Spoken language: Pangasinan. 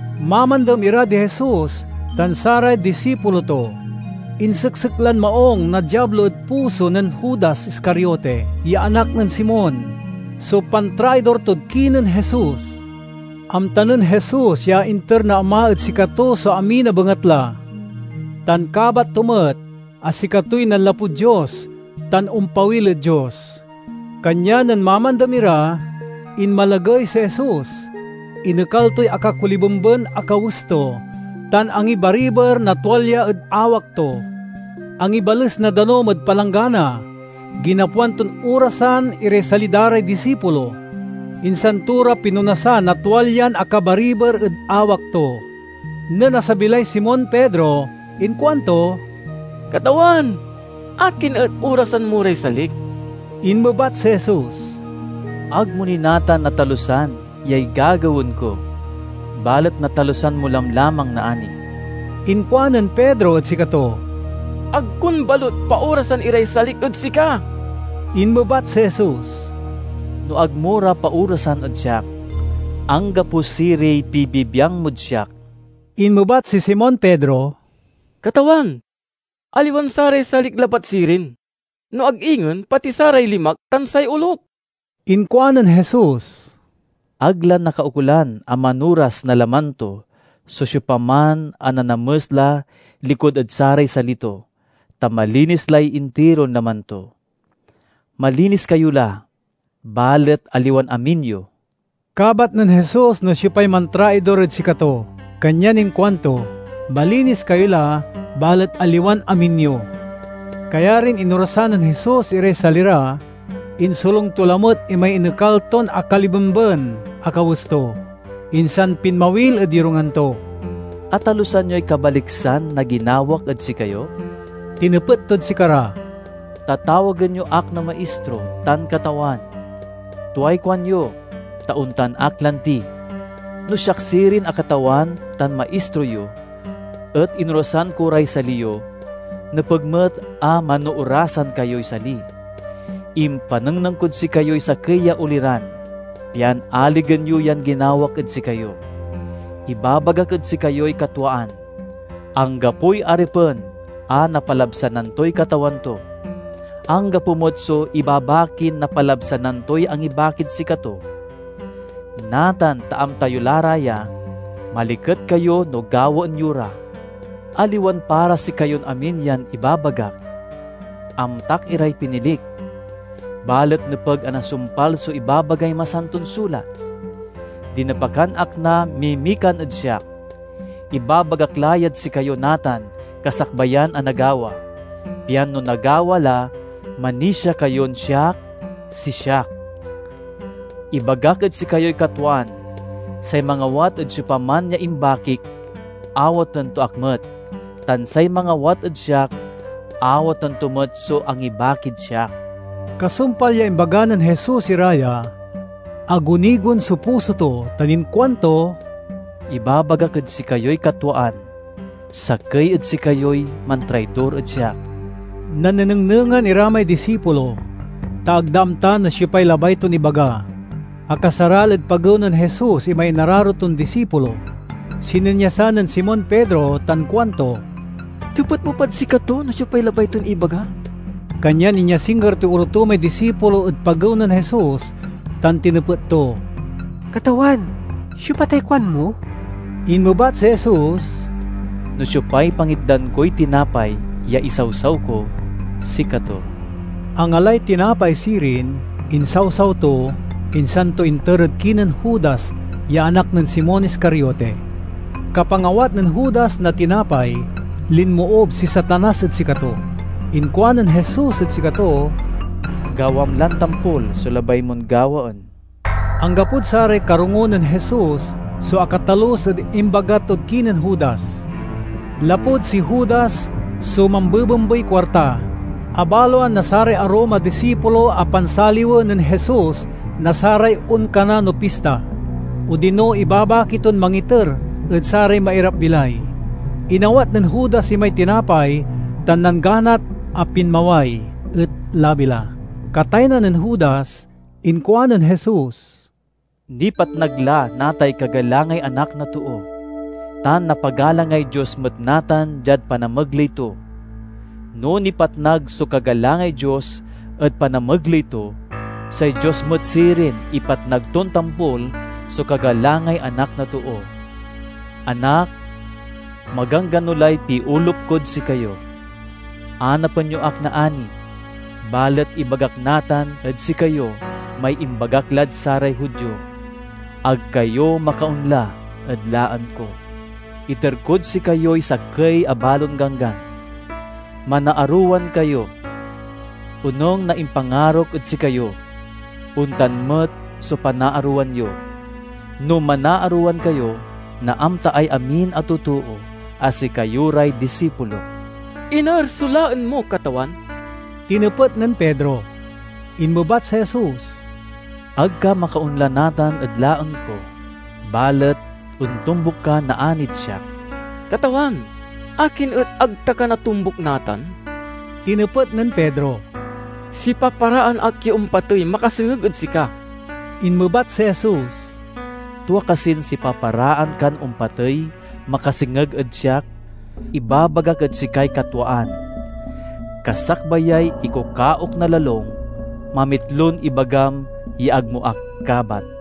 Mamandem ira di Jesus tan saray disipulo to. Inseksek lan maung na Diablo ed puso nen Judas Iscariote, ya anak nen Simon, so pantraidor tod kinen Jesus. Amta nen Jesus ya inter na Ama ed sikato so amin a bengatla, tan kabat to met a sikatoy nanlapud Dios tan ompawil ed Dios. Kanyan nen mamandem ira, inmalagey si Jesus, inekal toy akakolibemben a kawes to tan angibariber na tualya ed awak to. Angibales na danum ed palanggana, ginapoan ton orasan iray sali da ray disipulo, insan to ra pinonasan na tualyan akabariber ed awak to. Nen asabi lay Simon Pedro inkuanto, "Katawan, akin et orasan mo ray salik?" Inmebat si Jesus, "Ag mo ni natan natalusan yay gagawaen ko, balet natalusan mo lamlamang naani." Inkuanen Pedro ed sikato, "Ag kon balut paorasan iray salik ed sika!" Inmebat si Jesus, "No ag mo ra paorasan ed siak, anggapo siriy pibibiang mod siak." Inmebat si Simon Pedro, "Katawan, aliwan saray salik labat sirin, no ag ingen pati saray limak tan say olok!" Inkuanen Jesus, "Ag la nakaukolan a manoras na laman to so siopaman a nanames la likud ed saray sali to, ta malinis lay intiron laman to. Malinis kayo la, balet aliwan amin yo." (Kabat nen Jesus no siopay mantraidor ed sikato, kanyan inkuanto, "Malinis kayo la, balet aliwan amin yo.") Kayarin inorasan nen Jesus iray sali ra, insolung to lamet imay inekal ton akalibemben a kawes to, insan pinmawil ed yorungan to. "Atalusan yoy kabaliksan na ginawak ed sikayo?" tinepet tod sikara. "Tatawagen yo ak na Maistro tan Katawan. Tuay kuanyo, ta ontan ak lanti. No siak sirin a Katawan tan Maistro yo et inorasan ko ray sali yo, nepeg met a manoorasan kayoy sali. Impanengneng kod sikayoy sakey ya oliran, pian aligen yo yan ginawak ed sikayo. Ibabagak ed sikayoy katwaan: anggapoy aripen a napalabsanan toy katawan to. Anggapo met so ibabakin napalabsanan toy angibakid sikato. Natan ta amta yo la ra ya, maliket kayo no gawaen yo ra. "Aliwan para sikayon amin yan ibabagak; amtak iray pinilik. Balet nepeg a nasumpal so ibabagay Masanton Sulat, 'Dinepakan ak na mimikan ed siak.' Ibabagak la yad sikayo natan kasakbayan a nagawa, pian no nagawa la, manisia kayon 'Siak si Siak'. Ibagak ed sikayoy katwaan: say mangawat ed siopaman ya imbakik awaten to ak met, tan say mangawat ed siak awaten to met so angibakid siak." Kasumpal ya imbaga nen Jesus ira ya, agunigon so puso to tan inkuanto, "Ibabagak ed sikayoy katwaan: sakey ed sikayoy mantraidor ed siak." Nannenengnengan ira may disipulo, ta ag da amta no siopay labay ton ibaga. Akasaral ed pagew nen Jesus imay inararo ton disipulo. Sininyasan nen Simon Pedro tan kuanto, "Tepet mo pad sikato no siopay labay ton ibaga." Kanyan inyasingger toy olo to may disipulo ed pagew nen Jesus tan tinepet to, "Katawan, siopa tay kuanmo?" Inmebat si Jesus, "No siopay pangitdan koy tinapay ya isawsaw ko, sikato." Angalay tinapay sirin, insawsaw to, insan to inter ed kinen Judas ya anak nen Simon Iscariote. Kapangawat nen Judas na tinapay linmoob si Satanas ed sikato. Inkuanen Jesus ed sikato, "Gawam lan tampol so labay mon gawaen!" (Anggapod saray karongo nen Jesus so akatalus ed imbaga tod kinen Judas. Lapud si Judas so mambebembey kuarta, abaloan na saray arum a disipulo a pansaliwen nen Jesus na saray onkana no pista, odino ibabaki ton mangiter ed saray mairap-bilay.) Inawat nen Judas imay tinapay tan nangganat a pinmaway. Et labi la. Kataynan nen Judas, inkuanen Jesus, "Nipatnag la natay kagalangay Anak na Too, tan napagalangay Dios met natan diad panamegley to. No nipatnag so kagalangay Dios ed panamegley to, say Dios met sirin ipatnag ton tampol so kagalangay Anak na Too. Anak, maganggano lay piolup kod sikayo. Anapen yo ak naani, balet ibagak natan ed sikayo may imbagak lad saray Judio, 'Ag kayo makaonla ed laen ko.' Iter kod sikayoy sakey a balon ganggan: manaarowan kayo! Onung na impangarok ed sikayo, ontan met so panaarowan yo. No manaarowan kayo, naamtaay amin a totoo a sikayo ray disipulok." "Iner so laen mo, Katawan?" tinepet nen Pedro. Inmebat si Jesus, "Ag ka makaonla natan ed laen ko, balet ontombuk ka naanid siak." "Katawan, akin et ag ta ka natombuk natan?" tinepet nen Pedro. "Sipaparaan ak ya ompatey makasengeg ed sika!" Inmebat si Jesus, "Tua kasin sipaparaan kan ompatey makasengeg ed siak? Ibabagak ed sikay katwaan: kasakbayay ikukaok na lalung, mamitlon ibagam ya ag mo ak kabat."